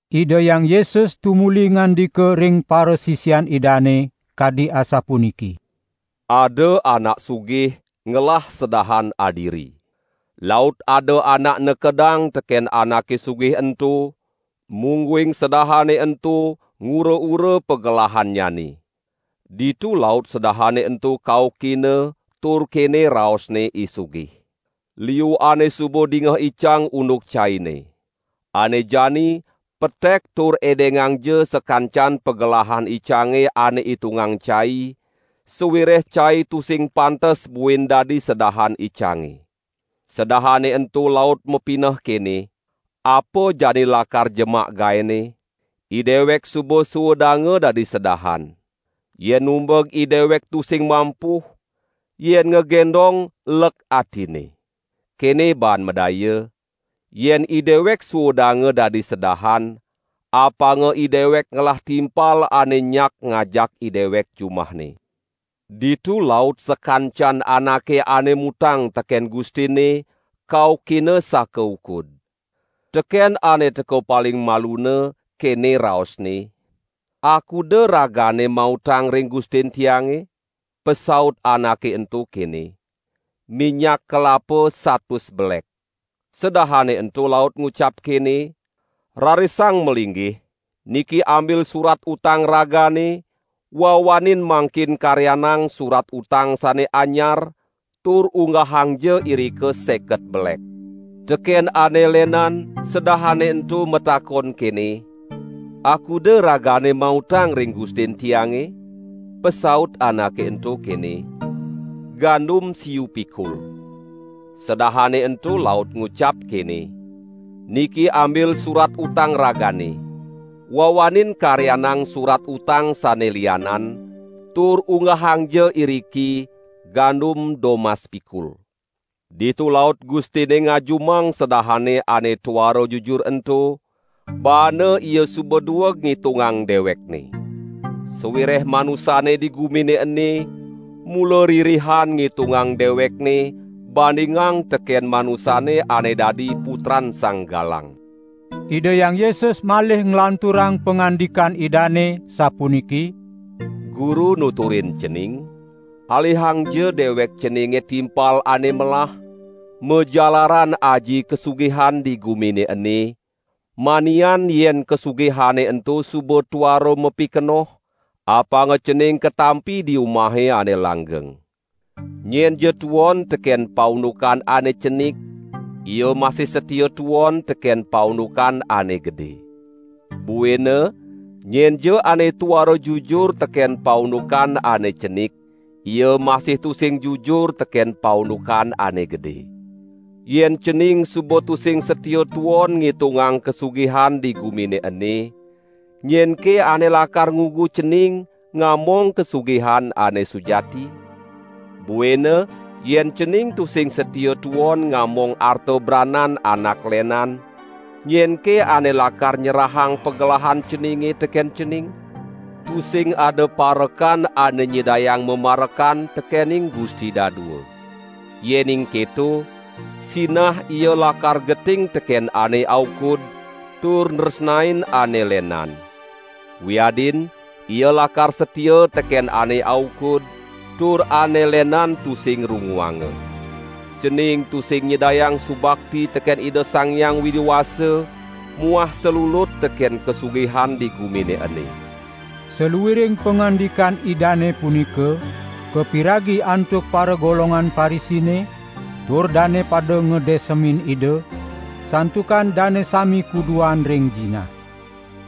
Ida Hyang Yesus tumuli ngandika ring parasisian Idane; kadi asapuniki: "Ada anak sugih ngelah sedahan adiri. Laut ada anak nekedang teken anake sugih ento, mungguing sedahane ento ngura-ura pagelahannyane. Ditu laut sedahane ento kaukina tur kene raosne I sugih: 'Liu ane suba dingeh icang unduk caine. Ane jani petek tur edengangja sakancan pagelahan icange ane itungang cai, sawireh cai tusing pantes buin dadi sedahan icange.' Sedahane ento laut mapineh kene: 'Apa jani lakar jemak gaene? Idewek suba suudanga dadi sedahan. Yen numbeg idewek tusing mampuh, yen ngagendong lek atine. Kene baan madaya, yen idewek suudanga dadi sedahan, apanga idewek ngelah timpal ane nyak ngajak idewek jumahne.' Ditu laut sakancan anake ane mutang teken gustinne, kaukina sakaukud. Teken ane teka paling maluna, kene raosne: 'Akuda ragane mautang ring gustin tiange?' Pasaut anake ento kene: 'Minyak kelapa satus belek.' Sedahane ento laut ngucap kene: 'Rarisang malinggih, niki ambil surat utang ragane, wawanin mangkin karyanang surat utang sane anyar, tur unggahangja irika seket belek.' Teken ane lenan sedahane ento matakon kene: 'Akuda ragane mautang ring gustin tiange?' Pasaut anake ento kene: 'Gandum siu pikul.' Sedahane ento laut ngucap kene: 'Niki ambil surat utang ragane. Wawanin karyanang surat utang sane lianan, tur unggahangja iriki: Gandum domas pikul.' Ditu laut gustinne ngajumang sedahane ane tuara jujur ento, baana ia suba dueg ngitungang dewekne. Sawireh manusane di gumine ene, mula ririhan ngitungang dewekne bandingang teken manusane ane dadi putran sang galang." Ida Hyang Yesus malih nglanturang pangandikan Idane, sapuniki: "Guru nuturin cening, alihangja dewek ceninge timpal ane melah, majalaran aji kasugihan di gumine ene, manian yen kasugihane ento suba tuara mapikenoh, apanga cening katampi di umahe ane langgeng. Nyenja tuon teken paundukan ane cenik, ia masih satia tuon teken paundukan ane gede. Buina nyenja ane tuara jujur teken paundukan ane cenik, ia masih tusing jujur teken paundukan ane gede. Yen cening suba tusing satia tuon ngitungang kasugihan di gumine ene, nyenke ane lakar ngugu cening ngamong kasugihan ane sujati? Buina yen cening tusing satia tuon ngamong arta branan anak lenan, nyenke ane lakar nyerahang pagelahan ceninge teken cening? Tusing ada parekan ane nyidayang mamarekan tekening gusti dadua. Yening keto, sinah ia lakar geting teken ane aukud tur nresnain ane lenan. Wiadin ia lakar satia teken ane aukud, tur ane lenan tusing runguanga. Cening tusing nyidayang subakti teken Ida Sang Hyang Widi Wasa muah salulut teken kasugihan di gumine ene." Saluiring pangandikan Idane punika kapiragi antuk paragolongan Parisine, tur dane pada ngadesemin Ida, santukan dane sami kuduan ring jinah.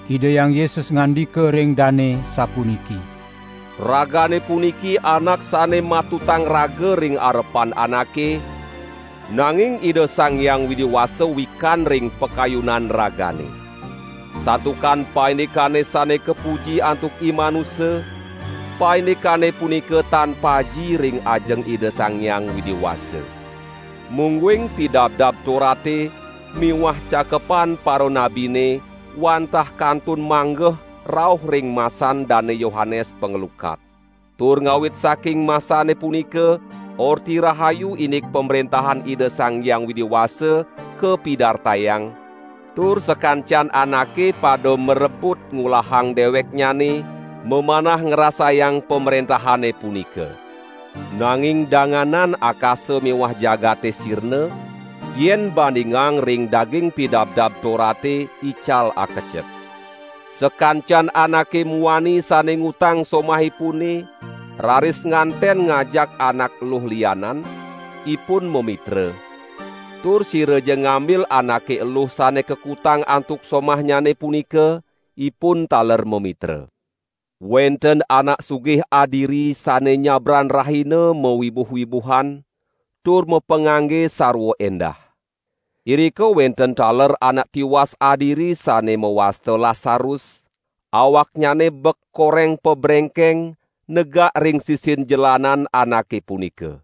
Ida Hyang Yesus ngandika ring dane sapuniki: "Ragane puniki anak sane matutang raga ring arepan anake, nanging Ida Sang Hyang Widi Wasa wikan ring pakayunan ragane. Santukan paindikane sane kapuji antuk imanusa, paindikane punika tan paji ring ajeng Ida Sang Hyang Widi Wasa. Mungguing Pidabdab Torate miwah Cakepan Paranabine wantah kantun manggeh rauh ring masan Dane Yohanes Panglukat. Tur ngawit saking masane punika Orti Rahayu indik Pamrentahan Ida Sang Hyang Widi Wasa kapidartayang, tur sakancan anake pada marebut ngulahang deweknyane mamanah ngrasayang pamrentahane punika. Nanging danganan akasa miwah jagate sirna, yen bandingang ring daging Pidabdab Torate ical akecek. Sakancan anake muani sane ngutang somahipune, raris nganten ngajak anak eluh lianan, ipun mamitra; tur siraja ngambil anake eluh sane kakutang antuk somahnyane punika, ipun taler mamitra." "Wenten anak sugih adiri sane nyabran rahina mawibuh-wibuhan tur mapangangge sarwa endah. Irika wenten taler anak tiwas adiri sane mawasta Lasarus, awaknyane bek koreng pabrengkeng negak ring sisin jelanan anake punika.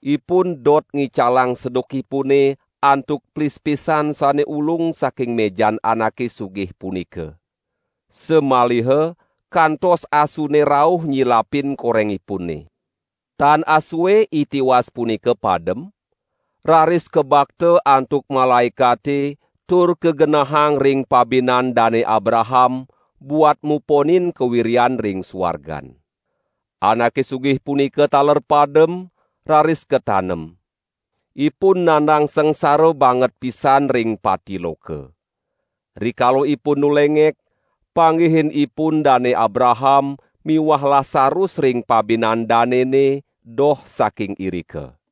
Ipun dot ngicalang sedukipune antuk plispisan sane ulung saking mejan anake sugih punika. Samaliha kantos asune rauh nyilapin korengipune. Tan asue I tiwas punika padem, raris kabakta antuk malaekate tur kagenahang ring pabinan Dane Abraham buat muponin kawiryan ring suargan. Anake sugih punika taler padem, raris katanem. Ipun nandang sangsara banget pisan ring pati loka. Rikala ipun nulengek, panggihin ipun Dane Abraham miwah Lasarus ring pabinan danene doh saking irika.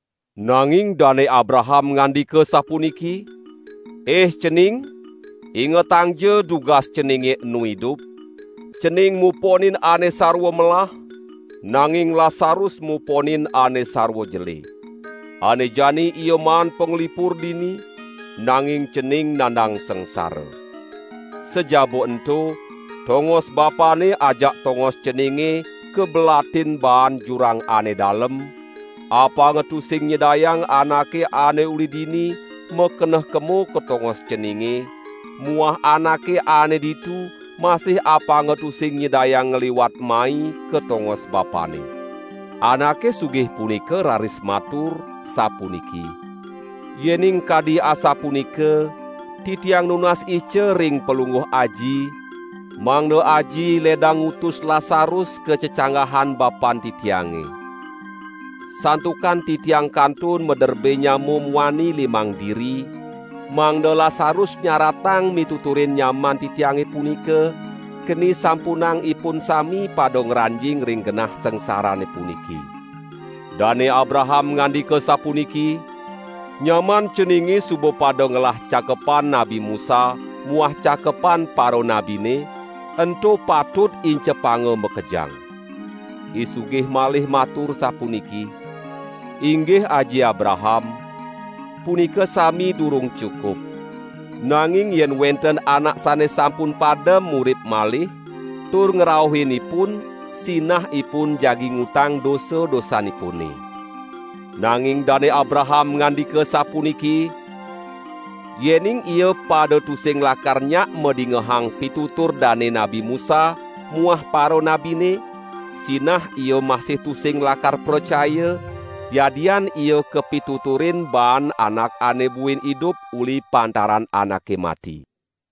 Nanging Dane Abraham ngandika sapuniki: 'Ih cening, ingetangja dugas ceninge enu idup, cening muponin ane sarwa melah, nanging Lasarus muponin ane sarwa jele. Ane jani ia maan panglipur dini, nanging cening nandang sangsara. Sajaba ento tongos bapane ajak tongos ceninge kabelatin baan jurang ane dalem, apanga tusing nyidayang anake ane uli dini makeneh kema ka tongos ceninge muah anake ane ditu masih apanga tusing nyidayang ngliwat mai ka tongos bapane.' Anake sugih punika raris matur, sapuniki: 'Yening kadi asapunika, titiang nunas ica ring palungguh aji, mangda aji ledang ngutus Lasarus ka cecanggahan bapan titiange. Santukan titiang kantun maderbe nyama muani limang diri, mangda Lasarus nyaratang mituturin nyaman titiange punika, keni sampunang ipun sami pada ngranjing ring genah sangsarane puniki.' Dane Abraham ngandika sapuniki: 'Nyaman ceninge suba pada ngelah Cakepan Nabi Musa muah Cakepan Paranabine, ento patut incepanga makejang.' I sugih malih matur sapuniki: 'Inggih Aji Abraham, punika sami durung cukup. Nanging yen wenten anak sane sampun padem murip malih, tur ngrauhin ipun, sinah ipun jagi ngutang dosa-dosanipune.' Nanging Dane Abraham ngandika sapuniki: 'Yening ia pada tusing lakar nyak madingehang pitutur dane Nabi Musa muah paranabine, sinah ia masih tusing lakar pracaya, yadian ia kapituturin baan anak ane buin idup uli pantaran anake mati.' "